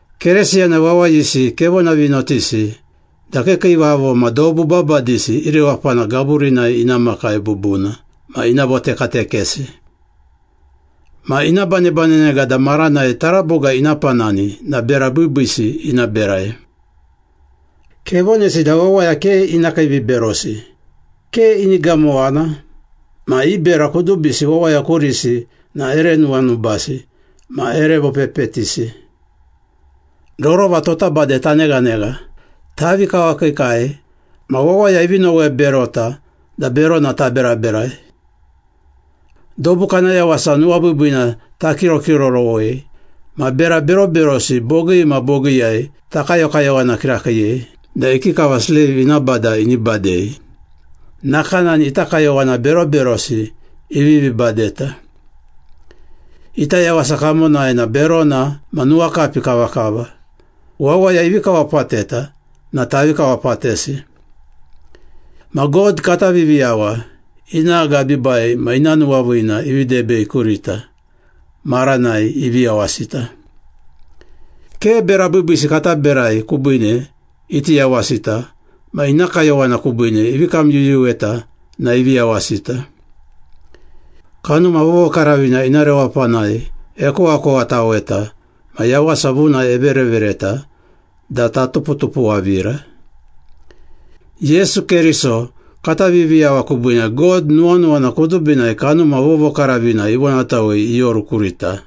Keresiyana wawayisi kevonavinotisi da kiikiivavo ma dobu babadisi i rewapana gaburinai ina makai bubuna ma ina votekatekesi. Ma ina banebanenega da maranai taraboga ina panani na bera biibiisi ina berai. Kevonesi da wawaya ke ina kiiviberosi, ke ini gamowana, ma i bera kudubisi wawaya kurisi na ere nuwanubasi ma ere vopepetisi. Rorova tota bade taneghanegha, tavi kawakiikai, ma wawaya ivi noweberota da berona taberaberai. Dobu kana yawasa nuwabiibiina takirokirorowei ma bera beroberosi bogii ma bogiiyai takayokayowana kirakiiyei da ikikava sleiv ina bada ini badei, nakanani ita kayowana beroberosi ivivi badeta. Ita yawasa kamonai na berona ma nuwakapi kavakava, wawaya ivi kawapateta na tavi kawapatesi. Ma God kata Viviyawa, ina agabiibai ma ina nuwaviina ivi debei kurita maranai ivi yawasita. Ke bera biibiisi kata berai kubiine iti yawasita ma ina kayowana kubiine ivi kamyuyuweta na ivi yawasita. Kanuma Vovokaravina ina rewapanai ekowakowataweta ma yawasa vuna everevereta da tatupuwatupuwavira. Yesu Keriso kata Viviyawa kubiine God nuwanuwana kudubinai Kanuma Vovokaravina ivonatawei ioru kurita,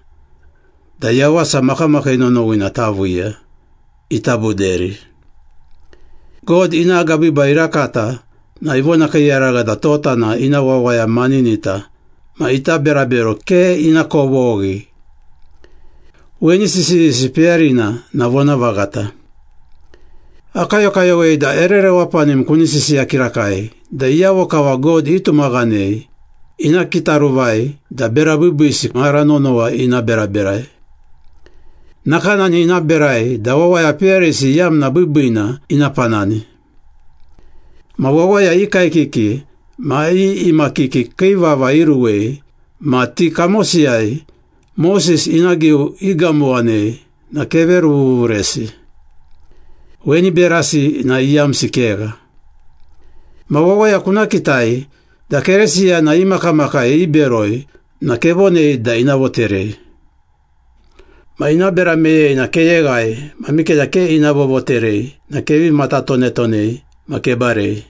da yawasa makamakii nonowina taviiya, ita buderi. God ina agabiibai irakata na ivonakiiyaragha da tota na ina wawaya maninita ma ita berabero ke ina kovoghi. Weni sisiyisi peyarina na vonavaghata. Akayokayowei da ere rewapanim kuni sisiya kirakai da iyavo kava God itumaghanei ina kitaruvai da bera biibiisi mara nonowa ina beraberai. Nakanani ina berai da wawaya peyarisi iyamna biibiina ina panani. Ma wawaya i kaekiki ma i imakiki kii vava iruwei ma ti kamosiyai Moses ina giu igamowanei na keveruvuvuresi. Weni berasi na iyamsi kegha. Ma wawaya kuna kitai da Keresiyana i makamakai iberoi na kevonei da ina voterei. Ma ina bera meyei na keyeghai ma mikeda ke ina vovoterei na kevi matatonetonei ma kebarei.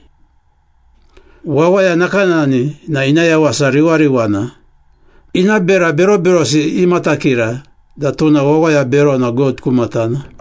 Wawaya nakanani na ina yawasa riwariwana, ina bera beroberosi imatakira da tuna wawaya berona God ku matana.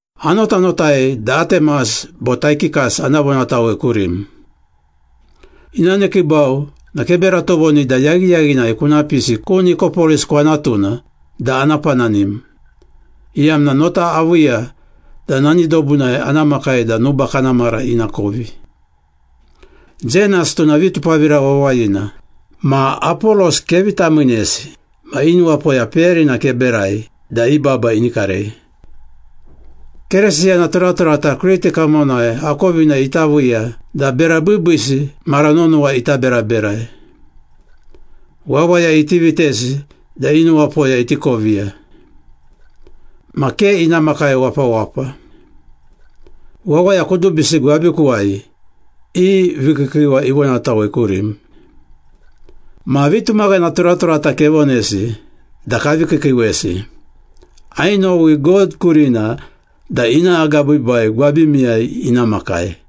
Anotanotai da Atemas bo Taikikas ana vonatawei kurim. Ina nekiibau na kebera tovoni da yaghiyaghinai kuna pisi ku Nikopolis kwanatuna da ana pananim, iyamna nota aviiya da nani dobunai ana makai da nuba kana mara ina kovi. Zenas, tuna vitupavira wawayina, ma Apolos kevi tamiinesi ma i nuwapoya peyarina keberai da i baba ini karei. Keresiyana turaturata Kriti kamonai akovina ita viiya da bera biibiisi mara nonowa ita beraberai. Wawaya iti vitesi da i nuwapoya iti koviya. Ma ke ina makai wapawapa. Wawaya kudubisi gwabikuwai i vikiikiiwa ivonatawei kurim. Ma vitumaghana turaturata kevonesi da kavi kiikiiwesi. Ainowi God kurina da ina agabiibai gwabimiyai ina makai.